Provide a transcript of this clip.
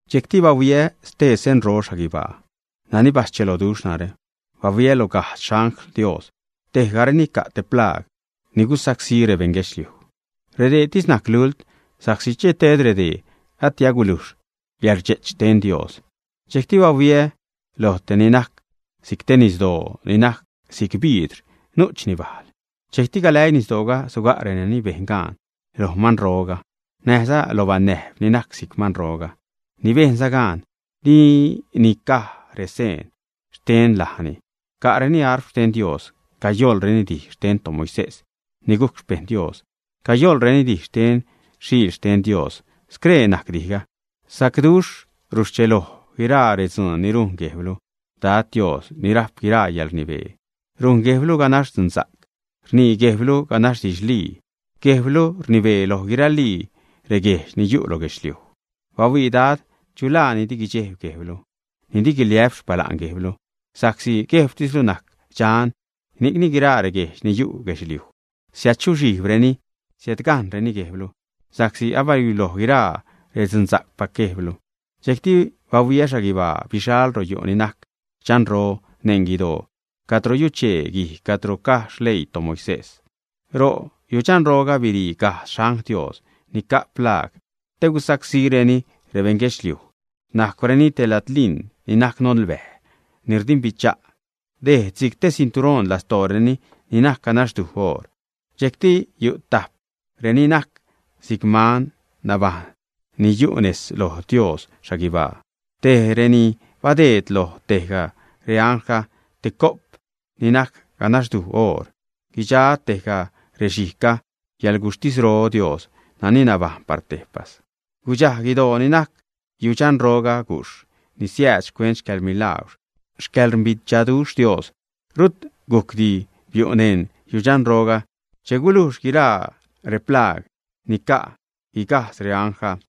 Dxejcti bahuiä stee senro xhaguibaa, nani bascheloduxh narä. Bahuiä loj gajdz xangl Dios, tejgareni ca' te plaag ni gusacsí rebeṉ guedxliuj. Redeetis najc lult, sa'csi che ted redee ati agulujx yäḻrdxe'ch xten Dios. Dxejcti bahuiä loj tej ni najc si'c te nisdoo ni najc si'c biidr nu'chni bajl. Dxejcti galäii nisdooga suga' renani bejn gaan loj manroga näjza lo banäjb ni najc si'c manroga, ni bejnza gaan di nica'reni seen xten lajni. Ca'reni arp xten Dios. Cayoḻreni dij xten toMoisés ni gujc xpejṉ Dios, cayoḻzareni dij xten Xiil xten Dios. Scree najc dijga: Sacduxh, ruscheloj guiraa redzuun ni rujn Guejblu, Dad Dios, ni rajp guiraa yäḻrnibee. Rujn Guejblu ganax dzunsa'c, rnii Guejblu ganax didxlii. Guejblu rnibee loj guiralii reguejdx ni yu' lo guedxliuj. Bahuii, Dad, ¿chu laa ni di guidxejb Guejblu ni di guiliä'p xpala'n Guejblu? Sa'csi Guejbtislu najc dxan, ni'cni guiraa reguejdx ni yu' guedxliuj siädzuxhijbreni, siädgajṉreni Guejblu, sa'csi abaluiloj guiraa rextzunsa'cpac Guejblu. Dxejcti bahuiä xhaguibaa, bixal ro' yu' ni najc dxanro neṉ guidoo, cadro yuchee guij cadro caj xleii toMoisés. Ro' yudxanroga birii gajdz xangl Dios ni ca' plaag te gusacsíreni rebeṉ guedxliuj. Najcwreni te ladliṉ ni najc nolbäj, ni rdimbichaduxh. Dejd si'c te cinturoṉ lastooreni ni najc ganaxduj oor. Dxejcti yu' tajp reni najc si'c man nabajṉ ni yu' nez loj Dios xhaguibaa. Tej reni badeed loj tejga reanglga te co'p ni najc ganaxduj oor. Guidxa tejga rexhijgga xcäḻguxhtisro Dios nani nabajṉ par tejpas. Gudxaj guidoo ni najc yudxanroruga gujxh ni siääd xcuent xcäḻmilaagwr, xcäḻrdimbichaduxh xten Dios. Rut gujcdi biu' neṉ yudxanroruga che gulujxli guiraa replaag ni ca' guigajdz reanglga.